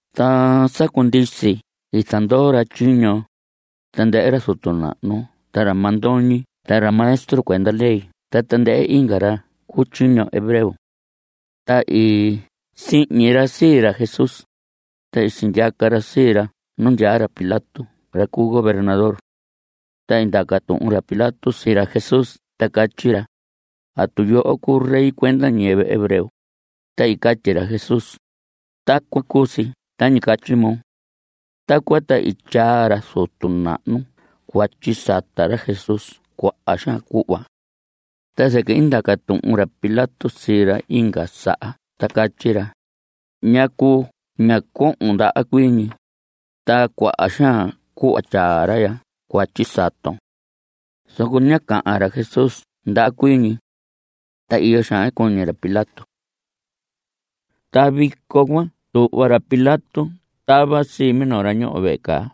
Ta sa cundisi i zandoo ra tyiño, tandɨhɨ ra zutu nahnu ta ra mandoñi ta ra maestro cuenda ley ta tandɨhɨ inga ra cu tyiño hebreo. Ta i sihñi ra sii ra Jesús, ta i sindyaca ra sii ra nu ndyaa ra Pilato (ra cu gobernador). Ta i ndaca tuhun ra Pilato sii ra Jesús ta catyi ra: ¿Atu yoho cuu rey cuenda ñiyɨvɨ hebreo? Ta i catyi ra Jesús: Tacuan cu si tañi catyi moo. Tacuan ta i tyaa ra zutu nahnu cuatyi sata ra Jesús cuaha xaan cuhva. Ta zɨquɨ i ndaca tuhun ra Pilato sii ra inga saha ta catyi ra: ¿Ñacu ña cohon ndaha cuii ñi? Ta cuaha xaan cuhva tyaa ra ya cuatyi saton. Zoco ñá cahan ra Jesús ndaha cuii ñi. Ta iyo xaan i cuñi ra Pilato. Ta vico cuan tuhva ra Pilato tava sii minoo ra ñoho vehe caa,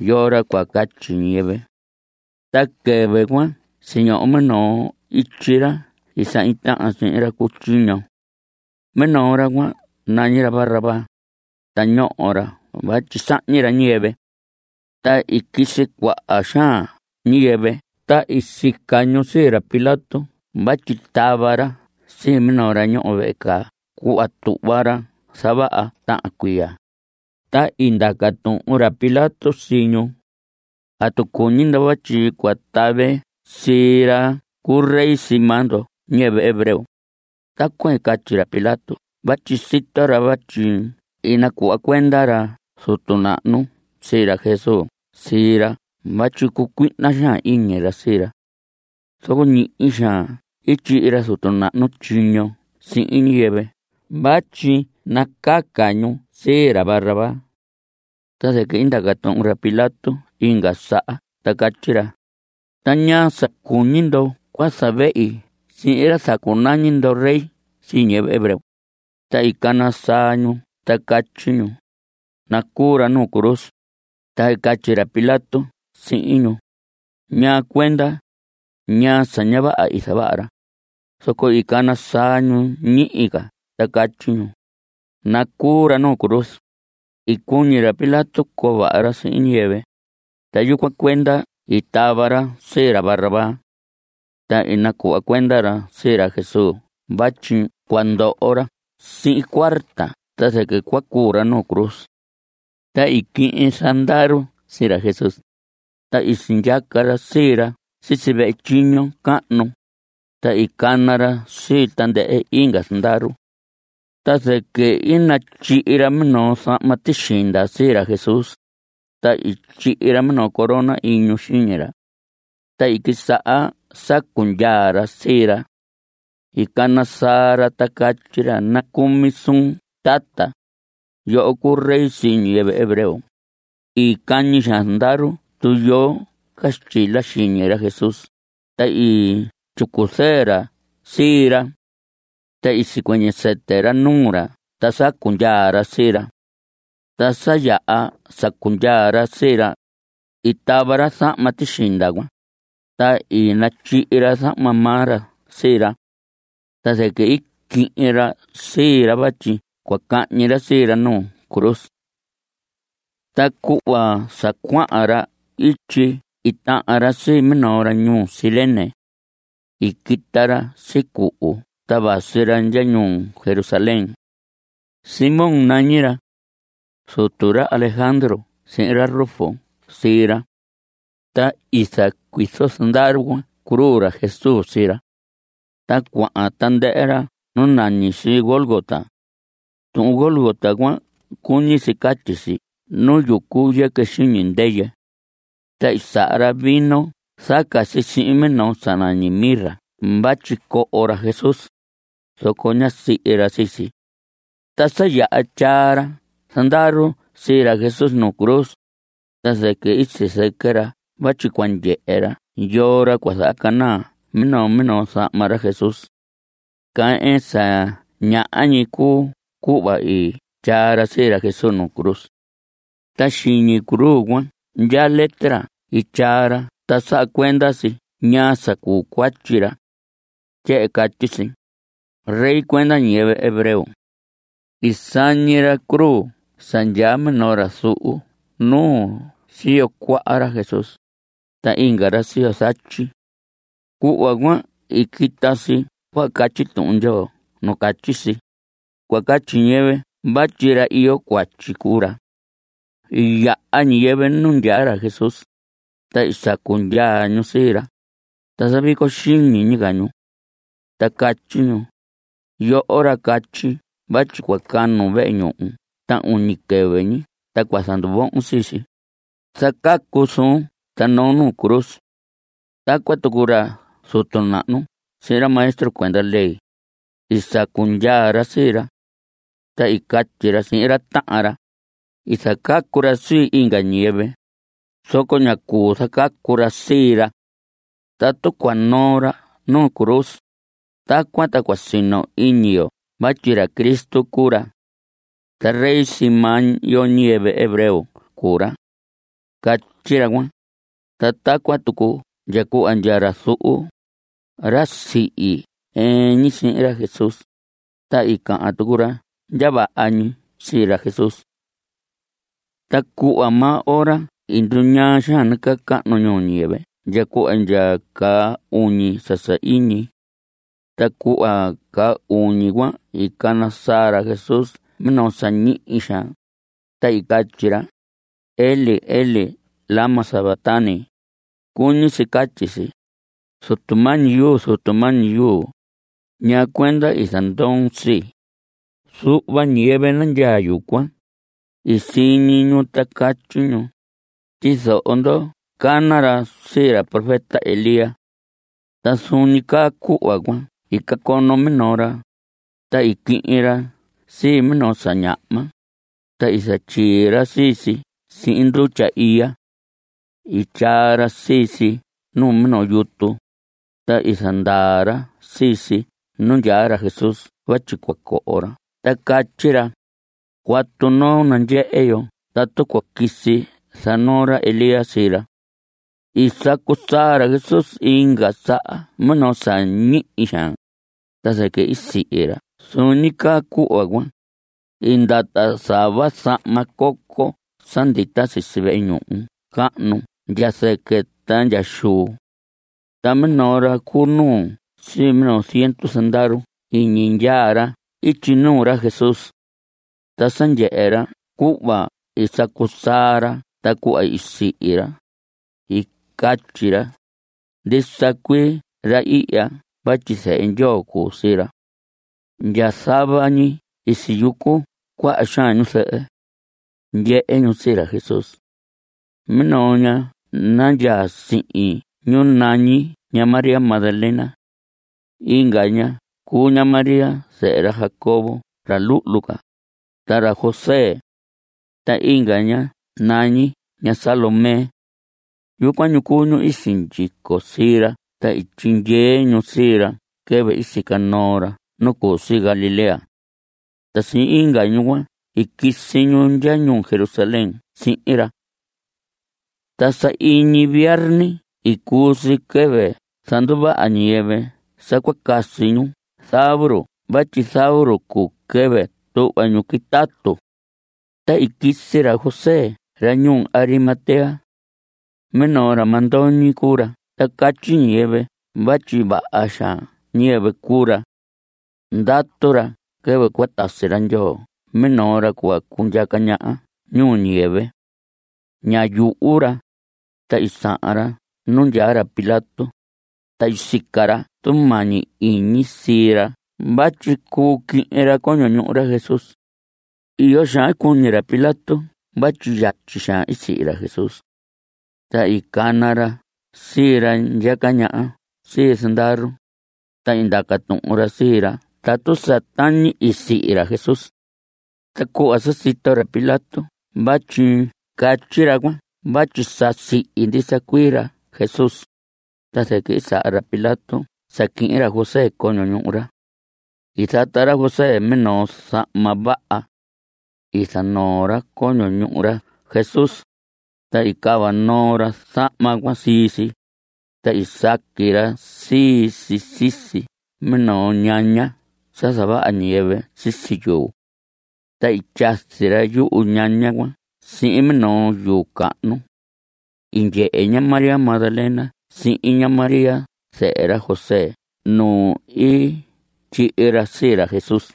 yoo ra cua catyi ñiyɨvɨ. Ta quɨvɨ cuan siñoho minoo ityi ra i sahñi tahan sihin ra cu tyiño. Minoo ra cuan nañi ra Barrabás, ta ñoho ra vatyi sahñi ra ñiyɨvɨ. Ta i quisi cuaha xaan ñiyɨvɨ ta i sica ñu sii ra Pilato vatyi tava ra sii minoo ra ñoho vehe caa cuhva tuhva ra zavaha tahan cuiya. Ta i ndaca tuhun ra Pilato sii ñu: ¿Atu cuñi ndo vatyi cua tave sii ra cu rey sii maa ndo ñiyɨvɨ hebreo? Tacuan i catyi ra Pilato vatyi sito ra vatyi i nacuhva cuenda ra zutu nahnu sii ra Jesús sii ra vatyi cucuihna xaan iñi ra sii ra. Zoco ñihi xaan i tyihi ra zutu nahnu tyiño sihin ñiyɨvɨ vatyi nacaca ñu sii ra Barrabás. Ta zɨquɨ i ndaca tuhun ra Pilato inga saha ta catyi ra: ¿Ta ñaa sa cuñi ndo cua zavehi sihin ra zacunañi ndo rey sii ñiyɨvɨ hebreo? Ta i cana saa ñu ta catyi ñu: ¡Nacuu ra nu cruz! Ta i catyi ra Pilato sihin ñu: ¿Ñaa cuenda? ¿Ñaa sa ña vaha i zavaha ra? Zoco i cana saa ñu ñihi ca ta catyi ñu: ¡Nacuu ra nu cruz! I cuñi ra Pilato coo vaha ra sihin ñiyɨvɨ, ta yucuan cuenda i tava ra sii ra Barrabás. Ta i nacuhva cuenda ra sii ra Jesús vatyi cua ndoho ra sihin cuarta ta zɨquɨ cua cuu ra nu cruz. Ta i quihin zandaru sii ra Jesús, ta i sindyaca ra sii ra sisi vehe tyiño cahnu, ta i cana ra sii tandɨhɨ inga zandaru. Ta zɨquɨ i natyihi ra minoo zahma tixinda sii ra Jesús, ta i tyihi ra minoo corona iñu xiñi ra. Ta i quisaha sacu ndyaa ra sii ra. I cana saa ra ta catyi ra: ¡Nacumi suun tata; yoho cuu rey sii ñiyɨvɨ hebreo! I cañi xaan zandaru tuyoo caxtyila xiñi ra Jesús, ta i tyicu zɨɨ ra sii ra. Ta i sicuɨñɨ sɨtɨ ra nuu ra ta sacu ndyaa ra sii ra. Ta sa yaha sacu ndyaa ra sii ra, i tava ra zahma tixinda cuan, ta i natyihi ra zahma maa ra sii ra. Ta zɨquɨ i quihin ra sii ra vatyi cua cahñi ra sii ra nu cruz. Ta cuhva sa cuahan ra ityi i tahan ra sii minoo ra ñuu Cirene. I quita ra sicuhu ta vasi ra ndya ñuu Jerusalén. Simón nañi ra. Zutu ra Alejandro sihin ra Rufo sii ra. Ta i zacuizo zandaru cuan cruz ra Jesús sii ra. Ta cuahan tandɨhɨ ra nu nañi si Gólgota. Tuhun Gólgota cuan cuñi si catyi si Nu Yucu Yɨquɨ Xiñi Ndɨyɨ. Ta i saha ra vino zaca si sihin minoo sa nañi mirra vatyi coho ra Jesús, zoco ñá sihi ra sii si. Ta sa yaha tyaa ra zandaru sii ra Jesús nu cruz, ta zɨquɨ i sizɨquɨ ra vatyi cua ndyehe ra yoo ra cua zahacanaa minoo minoo zahma ra Jesús. Caa ɨɨn sa ñaha ñi cuu cuhva i tyaa ra sii ra Jesús nu cruz. Ta xiñi cruz cuan ndyaa letra i tyaa ra ta saha cuenda si ñaa sa cuu cuatyi ra. Tyehen catyi si: “Rey cuenda ñiyɨvɨ hebreo.” I sañi ra cruz sa ndyaa minoo ra zuhu nuu siyo cuaha ra Jesús, ta inga ra siyo zatyi. Cuhva cuan i quita si cuhva catyi Tuhun Ndyoo nu catyi si: “Cua catyi ñiyɨvɨ vatyi ra iyo cuatyi cuu ra.” I yaha ñiyɨvɨ nu ndyaa ra Jesús, ta i sacu ndyaa ñu sii ra, ta zavico xiñi ñi ca ñu. Ta catyi ñu: Yoho ra catyi vatyi cua canun vehe ñuhu ta uñi quɨvɨ ñi ta cua zanduvohon sii si, zacacun suun ta noon nu cruz. Tacuan tucu ra zutu nahnu sihin ra maestro cuenda ley, i sacu ndyaa ra sii ra. Ta i catyi ra sihin ra tahan ra: I zacacu ra sii inga ñiyɨvɨ, zoco ña cuu zacacu ra sii ra. Tatu cua noo ra nu cruz, tacuan ta cua sino iñi yo vatyi ra Cristo cuu ra. Ta rey sii maa yo ñiyɨvɨ hebreo cuu ra. Catyi ra cuan. Ta tacuan tucu ndya cuhva ndya ra zuhu, ra sihi ɨɨn ñi sihin ra Jesús, ta i cahan tucu ra ndya vaha ñi sii ra Jesús. Ta cuhva maa ora i nduñaa xaan nacahnu ñuu ñiyɨvɨ ndya cuhva ndya caa uñi sa sahiñi. Ta cuhva caa uñi cuan i cana saa ra Jesús minoo sa ñihi xaan, ta i catyi ra: Elí, Elí, ¿lama sabactani? Cuñi si catyi si: Zutu mañi yu, Zutu mañi yu, ¿ñaa cuenda i zandoon sii? Zuhva ñiyɨvɨ nandyaa yucuan, i siñi ñu ta catyi ñu: Tyizoho ndo; cana ra sii ra profeta Elías. Ta zuun ñi caa cuhva cuan i cacono minoo ra, ta i quihin ra sii minoo sa ñahma, ta i zatyii ra sii si sihin ndutya iya. I tyaa ra sii si nu minoo yutu, ta i zandaa ra sii si nu ndyaa ra Jesús vatyi cua coho ra ta catyi ra: Cuatu noo, nandyehe yo tatu cua quisi zanoo ra Elías sii ra. I sacu saa ra Jesús inga saha minoo sa ñihi xaan, ta zɨquɨ i sihi ra. Zuun ñi caa cuhva cuan, i ndata zava zahma coco sa ndita sisi vehe ñuhu cahnu ndya zɨquɨ ta ndya xuu. Ta minoo ra cu nuu sii minoo ziendu zandaru i iñi ndyaa ra ityi nuu ra Jesús. Ta sa ndyehe ra cuhva i sacu saa ra ta cuhva i sihi ra, i catyi ra: Ndisa cuii ra ihya vatyi zehe Ndyoo cu sii ra. Ndya zava ñi i siyucu cuaha xaan ñu zɨhɨ. Ndyehe ñu sii ra Jesús. Minoo ña nandyaa sihin ñu nañi ña María Magdalena. Inga ña cuu ña María zɨhɨ ra Jacobo, ra luhlu ca, ta ra José. Ta inga ña nañi ña Salomé. Yucuan ñu cuu ñu i sindyico sii ra ta i tyindyee ñu sii ra quɨvɨ i sica noo ra nu cu si Galilea. Ta sihin inga ñu cuan i quisi ñu ndya ñuu Jerusalén sihin ra. Ta sahiñi viarni i cuu si, quɨvɨ zanduvaha ñiyɨvɨ sa cua casi ñu zavuru vatyi zavuru cuu quɨvɨ tuhva ñu quitatu. Ta i quisi ra José ra ñuu Arimatea. Minoo ra mandoñi cuu ra ta catyi ñiyɨvɨ vatyi vaha xaan ñiyɨvɨ cuu ra. Ndatu ra quɨvɨ cua tasi ra Ndyoo minoo ra cua cundyaca ñaha ñuu ñiyɨvɨ. Ñá yuhu ra, ta i sahan ra nu ndyaa ra Pilato, ta i sica ra tumañi iñi sii ra vatyi cuu quihin ra coño ñuhu ra Jesús. Iyo xaan i cuñi ra Pilato vatyi yatyi xaan i sihi ra Jesús. Ta i cana ra sii ra ndyaca ñaha sii zandaru, ta i ndaca tuhun ra sii ra tatu sa tañi i sihi ra Jesús. Ta cuhva sa sito ra Pilato vatyi catyi ra cuan vatyi sa sihi ndisa cuii ra Jesús, ta zɨquɨ i saha ra Pilato sa quihin ra José coño ñuhu ra. I zata ra José minoo zahma vaha. I zanoo ra coño ñuhu ra Jesús, ta i cava noo ra zahma cuan sii si, ta i saqui ra sii si sisi minoo ñaña sa zavaha ñiyɨvɨ sisi yuu. Ta i tyazi ra yuhu ñaña cuan sihin minoo yuu cahnu. I ndyehe ña María Magdalena sihin ña María zɨhɨ ra José nu i tyihi ra sii ra Jesús.